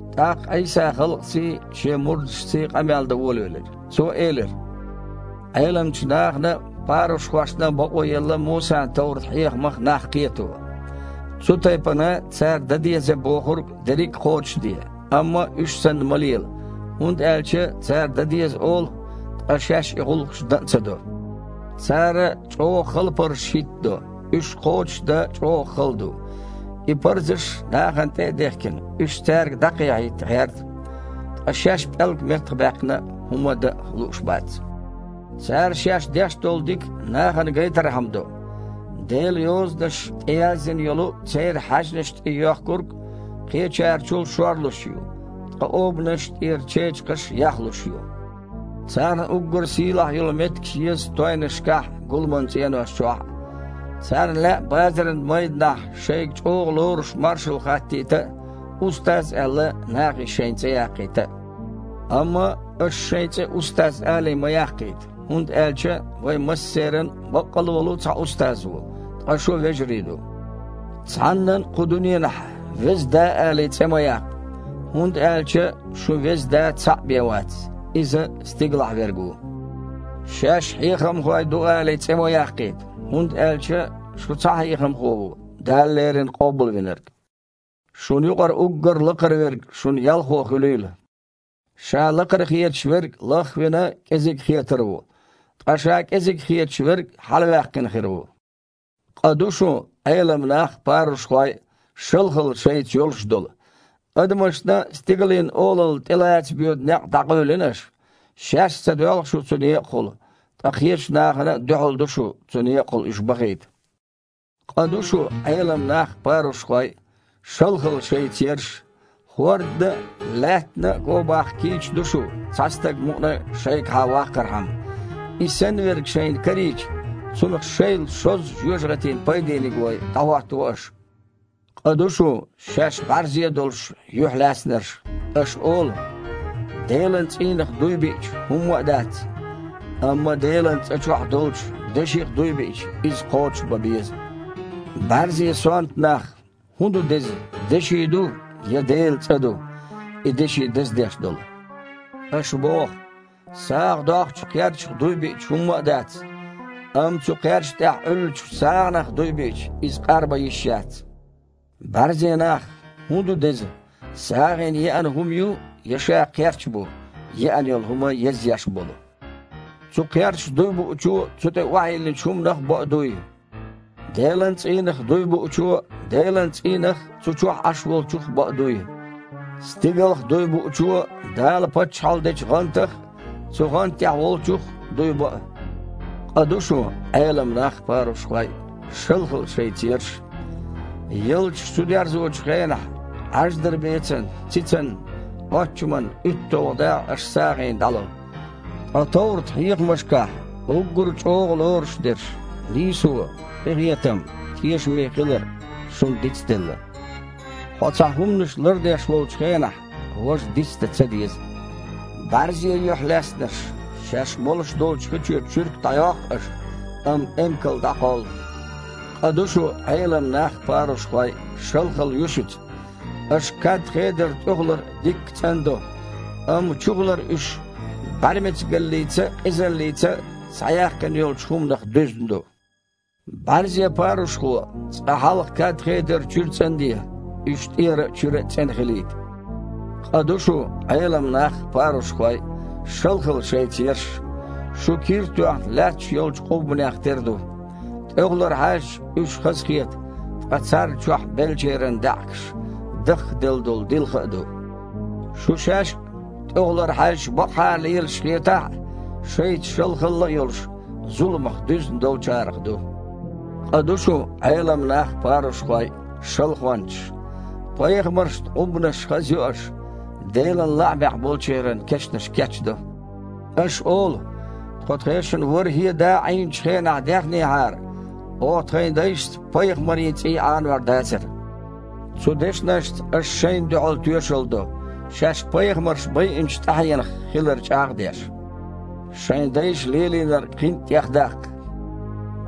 ТІаккха Іийса халкъаций, Шен мурдашций къамел дан волавелира. Цо элира: «Іеламчу нахана а, парушхошна а бакъо елла Мусан товрат-хьехамах нах кхето. Цу тайпана, цара дан деза бохург дерриг а кхочушде, амма уьш санна ма лела, хІунда аьлча цара дан деза олу, ткъа шаьш и гІуллакхаш дан а ца до. Цара чІогІа хала парзаш хІиттадо. Уьш кхочушдан чІогІа хала ду. И парзаш нахана тІе а дехкина, уьш цаьрга дІакхехьийта гІерта. Ткъа шаьш пІелг меттахбаьккхина а хІума дан лууш бац. Цара шаьш деш долу дика нахана гайтархьама до: Делан Йозанаш тІеяздина йолу церан хьаьжнаш тІе йоьхкург кхечерачул шорлуш ю, ткъа обанаш тІера чечакхаш яхлуш ю. Царна уггар сийлахь йолу меттигаш еза тойнашкахь а, гуламан цІенош чохь а. Царна лаьа базаран майданахь шайга чІогІа лоруш маршалла хаттийта а, „устаз“ аьлла, нахе шайн цІе яккхийта а. Амма аша шайн цІе, „устаз“ алий, ма яккхийта, хІунда аьлча вайн массеран а баккъалла а волу цхьа Устаз ву, ткъа шу вежарий ду. Цхьаннан а кху дуьненахь „Веза Да“ алий, цІе ма яккха, хІунда аьлча шун Веза Да цхьаъ бен вац. Иза – Стигалахь Верг ву. Шаьш „хьехамхой“ ду алий, цІе ма яккхийта, хІунда аьлча шун цхьа Хьехамхо ву – Дала леррина Къобалвинарг. Шуна юкъара уггар лакхара верг шун ялхо хуьлийла. Ша лакхара хеташ верг, лах а вина, кІезиг хетар ву, ткъа ша кІезиг хеташ верг хьалаваьккхина хир ву. Къа ду шун, Іелам нах а, парушхой а, шалхалла шайца йолуш долу! Адамашна Стигалийн Олалла тІелаца боьду некъ дІакъевлина аша. Шаьш а ца доьлху шу цу некъахула, ткъа кхечу нахана а дуьхьал ду шу цу некъахула уьш бахийта. Къа ду шун, Іелам нах а, парушхой а! Шалхалла шайца ерш! ХІордана а, лаьттана а гобаккха кийча ду шу, цхьа стаг мукъана а шайгахьа ваккхархьама. И санна верг шайна карийча, цунах шайл шозза жоьжахатина пайдениг вой, дІахІоттаво аша. Къа ду шун, шаьш бІаьрзе а долуш, юьхьлаьцнарш. Аша олу: „Делан цІийнах дуй биъча, хІумма а дац, амма Делан цІа чохь долчу деших дуй биъча, иза кхочушбан беза“. БІаьрзе, сонта нах! ХІун ду деза – деши ду, я Делан цІа ду, и деши даздеш долу? Аша боху: „СагІа доккхучу кхерчах дуй биъча, хІумма а дац. Амма цу кхерча тІехь Іуьллучу сагІанах дуй биъча, иза къарбан йиш яц!“ БІаьрзе нах! ХІун ду деза – сагІина еана хІума ю, я ша кхерч бу, еана йолу хІума язъеш болу? Цу кхерчах дуй буучо цу тІе охьайиллинчу хІуманах а боу дуй. Делан цІийнах дуй буучо Делан цІийнах а, цу чохь Іаш Волчух а боу дуй. Стигалх дуй буучо Дала паччахьалла дечу гІантах а, цу гІанта тІехь Волчух а дуй боу. Къа ду шун, Іелам нах а, парушхой а. Шалхалла шайца ерш! Ялташ чудерзочу хенахь Іаждарбецан, цицан, оччаман уьтталгІа дакъа аша сагІина дІало, ткъа товрат-хьехамашкахь уггар чІогІа лоруш дерш – нийсо, къинхетам, тешаме хилар – шуна дицделла. Хьо цхьа хІуманаш лардеш волчу хенахь важа дицдан ца деза. БІаьрзе юьхьлаьцнарш! Шаьш молуш долчу хи чуьра чуьрк дІайоккху аша, амма эмкал дІакхоллу. Къа ду шун, Іелам нах а, парушхой а. Шалхалла ю шуьца! Аша кад-хедар тІехулара дикка цІандо, амма чухулара уьш бІаьрмецигаллица а, къизаллица а схьаяьккхина йолчу хІуманах дуьзна ду. БІаьрзе парушхо, цкъа хьалха кад-хедар чуьра цІанде, уьш тІера а, чуьра а цІена хилийта. Къа ду шун, Іелам нах а, парушхой а. Шалхалла шайца ерш! Шу, кир а тоьхна, лаьтташ йолчу къуббанех тера ду. ТІехулара хьаьжча, уьш хазахета, ткъа царна чохь беллачеран даьІахкаш, дахкаделла долу дилха а ду. Шу шаьш а, тІехулара хьаьжча бакъахьара лелаш хетахь а, шайца шалхалла а йолуш, зуламах дуьзна долчарах ду. Къа ду шун, Іелам нах а, парушхой а! Шалхончаш! Пайхамаршна къуббанаш хазйо аша, Делан лаамехь болчеран кешнаш кечдо. Аша олу: „Тхо тхешан ворхІе а да Іийначу хенахь даьхнехьара, оха тхайн дайшца пайхамарийн цІий Іанор дацара“. Цу дешнашца аша шайна дуьхьал тоьшалла до, шаьш пайхамарш байинчу тІаьхьенах хилар чІагІ а деш. Шайн дайша лелийнарг кхин а тІехдаккха!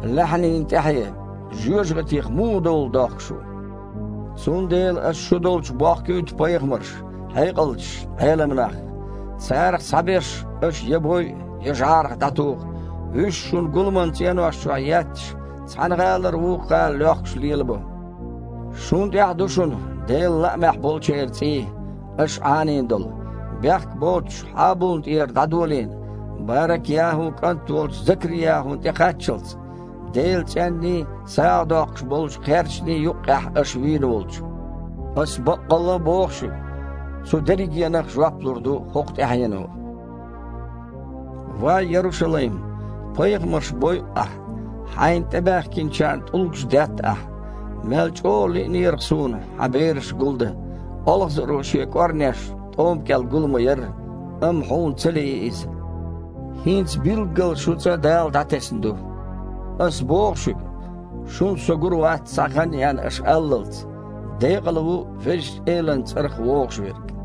Лаьхьанийн тІаьхье! Жоьжахатих муха довла дохку шу? Цундела Аса шу долчу бохкуьйту пайхамарш, хьекъалчаш, Іелам нах. Царах цхьаберш аша я бойу, я жІарах дІатуху, вуьш, шун гуламан цІенош чохь етташ, цхьана гІалара вукху гІала лоьхкуш лелабо. Шуна тІехь ду шуна Делан лаамехь болчеран цІий, аша Іанийна долу, бехк боцучу Хьабулна тІера дІадолийна Барак-ЯхІун кІант волчу Закри-ЯхІуна тІекхаччалц, Делан цІенний, сагІа доккхуш болчу кхерчаний юккъехь аша вийна волчу. Аса баккъалла а боху шуьга, цу дерригенах а жоп лур ду хІокху тІаьхьено». «Ва Ярушалайм! Пайхамарш бойу ахь, хьайна тІебахкийтиначарна тІулгаш детта ахь. Мел чІогІа лиънера-кх Суна хьан бераш гулдан, олхазаро шен кІорнеш тІома кІел гул ма-ярра, амма хьуна ца лии иза. ХІинца билггала шун ЦІа Дала дІатесна ду. Ас боху шуьга, шуна Со гур вац, цхьа хан а еана, аш аллалц: „Декъала ву Везачу Элан цІарах вогІуш верг!“»